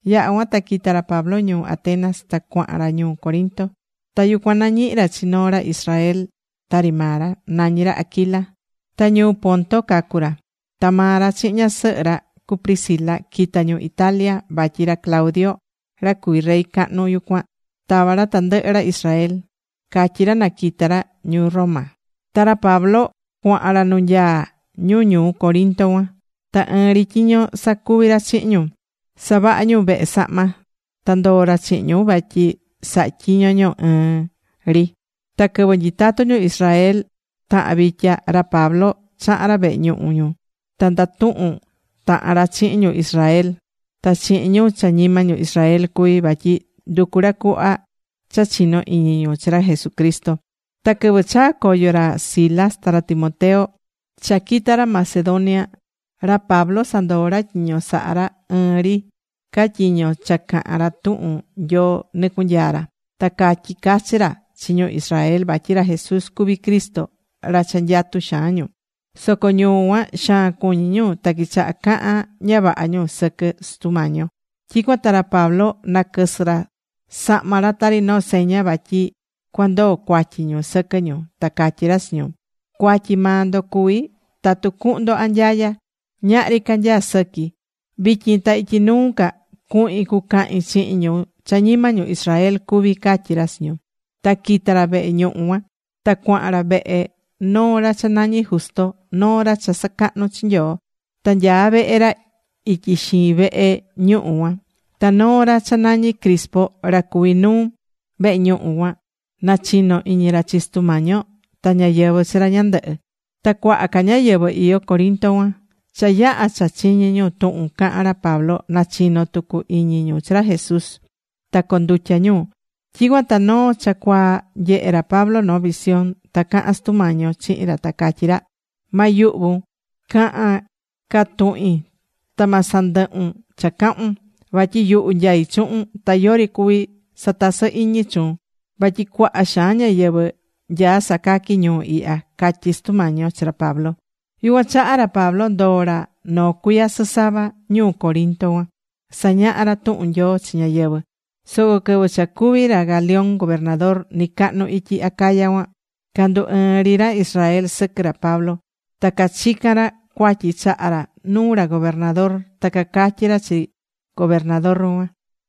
Yaha̱ cuan ta quita̱ ra Pablo ñuu Atenas ta cuahan ra ñuu Corinto. Ta yucuan nañihi̱ ra chi noo ra Israel tari maa ra. Nañí ra Aquila. Ta ñuu Ponto cacu̱ ra. Ta maa ra chihin ñasɨhɨ ra, cu Priscila quita̱ ñu Italia. vatyi ra Claudio, ra cuví rey cahnu yucuan, tava̱ ra tandɨhɨ ra Israel. Catyí ra na quita ra ñuu Roma. Ta ra Pablo cuahan ra nu nyaá ñu ñuu Corinto cuan. Ta ɨɨn ri tyiño sacuví ra chihin ñu. Savahá ñu vehe sahma. Ta ndoo̱ ra chihin ñu vatyi sahá tyiño ñu ɨɨn ri. Ta quɨvɨ nyitatu ñu Israel tahan vitya, ra Pablo chaha̱n ra vehe ñuhu ñu. Ta ndatuhun tahan ra chihin ñu Israel ta chihin ñu cha ñima ñu Israel cuví. Vatyi nducú ra cuhva cha chino iñi ñu chi ra Jesucristo. Ta quɨvɨ chaa̱ coyo ra Silas ta ra Timoteo cha quita̱ ra Macedonia, ra Pablo sandoo̱ ra tyiño sahá ra ta ɨɨn ri ca tyiño cha cahán ra tuhun Nyoo nɨcunyaa̱ ra. Ta catyi̱ cachi ra chi ñu Israel vatyi ra Jesús cuví Cristo ra cha nyatú xaan ñu. Soco ñu cuan xaan cuñi̱ ñu. Ta quichaha̱ cahan ña vaha ñu sɨquɨ Sutu Mañi yo. Tyicuan ta ra Pablo naquɨsɨ̱ ra sahma ra tari noo seña vatyi cuandoo cuatyi ñu sɨquɨ ñu. Ta catyí ra chi ñu: ―Cuatyi maa ndo cuví tatu cuhun ndo anyaya. Ñahri ca nyaá sɨqui. Vityin ta ityi nuu ca cuhin cucahin chihin ñu cha ñima ñu Israel cuví ―catyí ra chi ñu. Ta quita̱ ra vehe ñuhu cuan. Ta cuahan ra vehe noo ra cha nañí Justo. Noo ra cha sacahnú chi Nyoo. Ta nyaá vehe ra ityi xiin vehe ñuhu cuan. Ta noo ra cha nañí Crispo, ra cuví nuu vehe ñuhu cuan nachino̱ iñi ra chi Sutu Mañi yo, ta ñáyɨvɨ chi ra ñandɨhɨ. Ta cuaha ca ñáyɨvɨ iyó Corinto cuan, cha yaha̱ cha chiñi̱ ñu tuhun cahán ra Pablo, nachino̱ tucu iñi ñu chi ra Jesús, ta condutya̱ ñu. Tyicuan ta noo cha cuaa nyehe̱ ra Pablo noo visión. Ta caha̱n Sutu Mañi yo chihin ra, ta catyí ra: ―Ma yuhvun. Ca̱han ca tuhin ta ma sandɨhun cha cahun. Vatyi yuhu nyaí chuhun. Ta yori cuví satasɨ iñi chuun. Vatyi cuaha xaan ñáyɨvɨ nyaá sacaqui ñuu ihya ―catyí Sutu Mañi yo chi ra Pablo. Yucuan chaha ra Pablo ndoo̱ ra noo cuiya sɨsava ñuu Corinto cuan. Sañahá ra tuhun Nyoo chi ñáyɨvɨ. Soco quɨvɨ cha cuví ra Galión gobernador nɨcahnu ityi Acaya cuan, candu ɨɨ̱n ri ra Israel sɨquɨ ra Pablo. Ta cachica̱n ra cuatyi chaha ra nuu ra gobernador. Ta cacatyí ra chi gobernador cuan: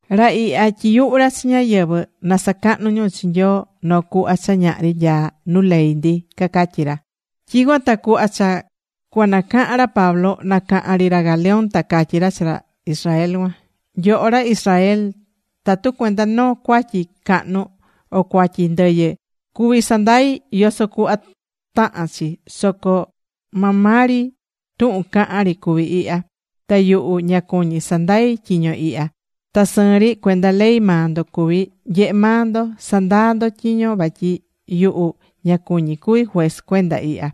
―Ra ihya tyiyuhú ra chi ñáyɨvɨ na sacahnu ñu chi Nyoo noo cuhva cha ñahri nyaá nu ley ndi ―cacatyí ra. Tyicuan ta cuhva cha cuanacahan ra Pablo, nacahan ri ra Galión, ta catyí ra chi ra Israel cuan: ―Nyoho ra Israel, tatu cuenda noo cuatyi cahnu o cuatyi ndɨyɨ cuví sandai yoso cuhva tahán chi. Soco maa maa ri tuhun cahán ri cuví ihya. Ta yuhu ña cuñí sandai tyiño ihya, ta sɨɨn ri cuenda ley maa ndo cuví. Nye̱he maa ndo. Sa̱ndaa ndo tyiño vatyi yuhu ña cuñí cuvi juez cuenda ihya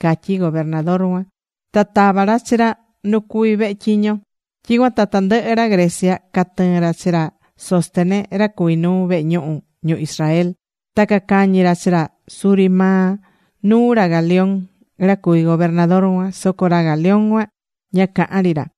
―catyí gobernador cuan. Ta tava̱ ra chi ra nu cuví vehe tyiño ra. Tyicuan ta tandɨhɨ ra Grecia catɨɨ̱n ra chi ra Sóstenes, ra cuví nuu vehe ñuhu ñu Israel. Ta cacañi̱ ra chi ra suri maa nuu ra Galión, ra cuví gobernador cuan. Soco ra Galión cuan ña caha̱n ri ra.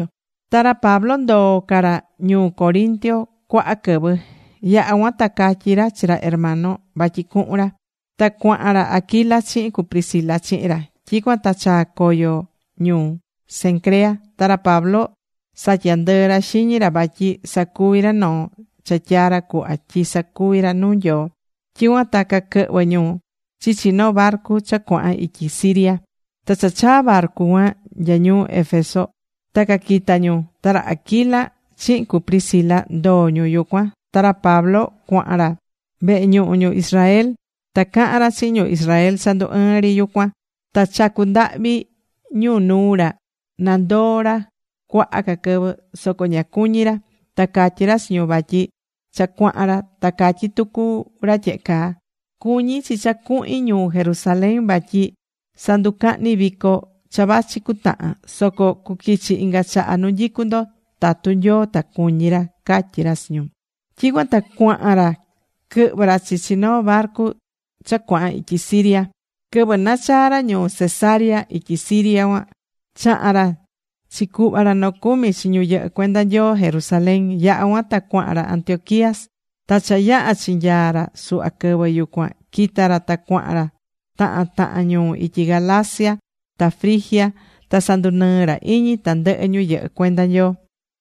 Ta ra Pablo ndoo̱ ca ra ñuu Corinto cuaha quɨvɨ. Yaha̱ cuan ta catyi̱ ra chi ra hermano vatyi cuhun ra. Ta cuahan ra Aquila chihin cu Priscila chihin ra Pablo. Tyicuan ta chaa̱ coyo ñu Cencrea. Ta ra Pablo satya̱ ndɨɨ ra xiñi ra vatyi sacuví ra noo cha tyaá ra cuhva tyi sacuvi ra nuu Nyoo. Tyicuan ta caquɨhvɨ ñu chichi noo barcu cha cuahan ityi Siria. Ta cha chaa̱ barcu cuan nya ñuu Éfeso, ta caquita̱ ñu. Ta ra Aquila chihin cu Priscila ndoo̱ ñu yucuan. Ta ra Pablo cuahan ra vehe ñuhu ñu Israel. Ta caha̱n ra chihin ñu Israel cha ndu ɨɨ́n ri yucuan. Ta chacu̱ ndahvi ñu nuu ra na ndoo̱ ra cuaha ca quɨvɨ. Soco ña cuñí ra. Ta catyí ra chi ñu vatyi cha cuahan ra, ta catyí tucu ra tyehe caa: ―Cuñí chi cha cuhin ñuu Jerusalén vatyi sanducahni vico cha vachi cutahan. Soco cuquichi inga chaha nu nyicu ndo tatu Nyoo ta cuñí ra ―catyí ra chi ñu. Tyicuan ta cuahan ra quɨhvɨ̱ ra chichi noo barcu cha cuahan ityi Siria. Quɨvɨ nachaa̱ ra ñuu Cesarea ityi Siria cuan, chaha̱n ra chicuhva ra nocumi chi ñu yɨhɨ́ cuenda Nyoo Jerusalén. Yaha̱ cuan ta cuahan ra Antioquía. Ta cha yaha̱ chinyaa̱ ra suhva quɨvɨ yucuan, quita̱ ra ta cuahan ra tahan tahan ñuu ityi Galacia ta Frigia. Ta sandunɨɨ̱ ra iñi tandɨhɨ ñu yɨhɨ́ cuenda Nyoo.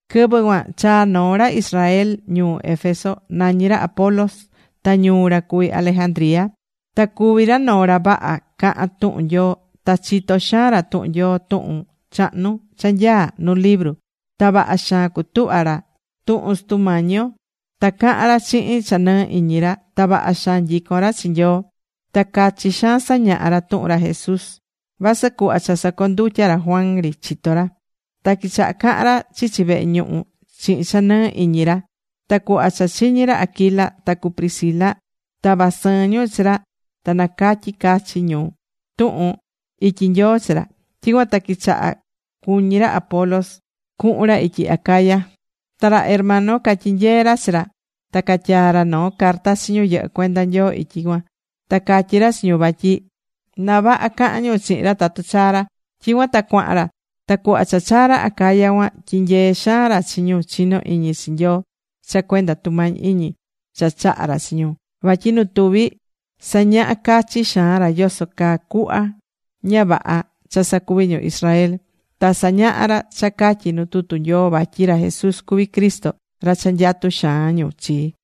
Quɨvɨ cuan chaa̱ noo ra Israel ñuu Éfeso. Nañí ra Apolos. Ta ñuu ra cuvi Alejandría. Ta cuví ra minoo ra vaha cahán tuhun Nyoo. Ta chitó xaan ra tuhun Nyoo tuhun chahnu cha nyaá nu libru. Ta vaha xaan cutuhva̱ ra tuhun Sutu Mañi yo. Ta cahán ra chihin cha nɨɨ iñi ra. Ta vaha xaan nyicón ra chi Nyoo. Ta cachi xaan sañahá ra tuhun ra Jesús. Vasɨ cuhva cha sacondutya̱ ra Juan ri chitó ra. Ta quichaha̱ cahan ra chichi vehe ñuhu chihin cha nɨɨ iñi ra. Ta cuhva cha chiñi̱ ra Aquila ta cu Priscila, tava̱ sɨɨn ñu chi ra ta nacatyi̱ cachi ca ñu tuhun ityi Nyoo chi ra. Tyicuan ta quichaha cuñí ra Apolos cuhun ra ityi Acaya. Ta ra hermano catyinyee̱ ra chi ra. Ta catyaa̱ ra noo carta chi ñu yɨhɨ́ cuenda Nyoo ityi cuan, ta catyí ra chi ñu vatyi na vaha cahan ñu chihin ra tatu chaa ra. Tyicuan ta cuahan ra. Ta cuhva cha chaa̱ ra Acaya cuan tyinyee̱ xaan ra chi ñu chinó iñi chi Nyoo cha cuenda tumañi iñi cha chaha̱ ra chi ñu. Vatyi nu tuvi sañaha̱ cachi xaan ra yoso caa cuhva ña vaha cha sacuví ñu Israel. Ta sañaha̱ ra cha catyí nu tutu Nyoo vatyi ra Jesús cuví Cristo, ra cha nyatú xaan ñu chi.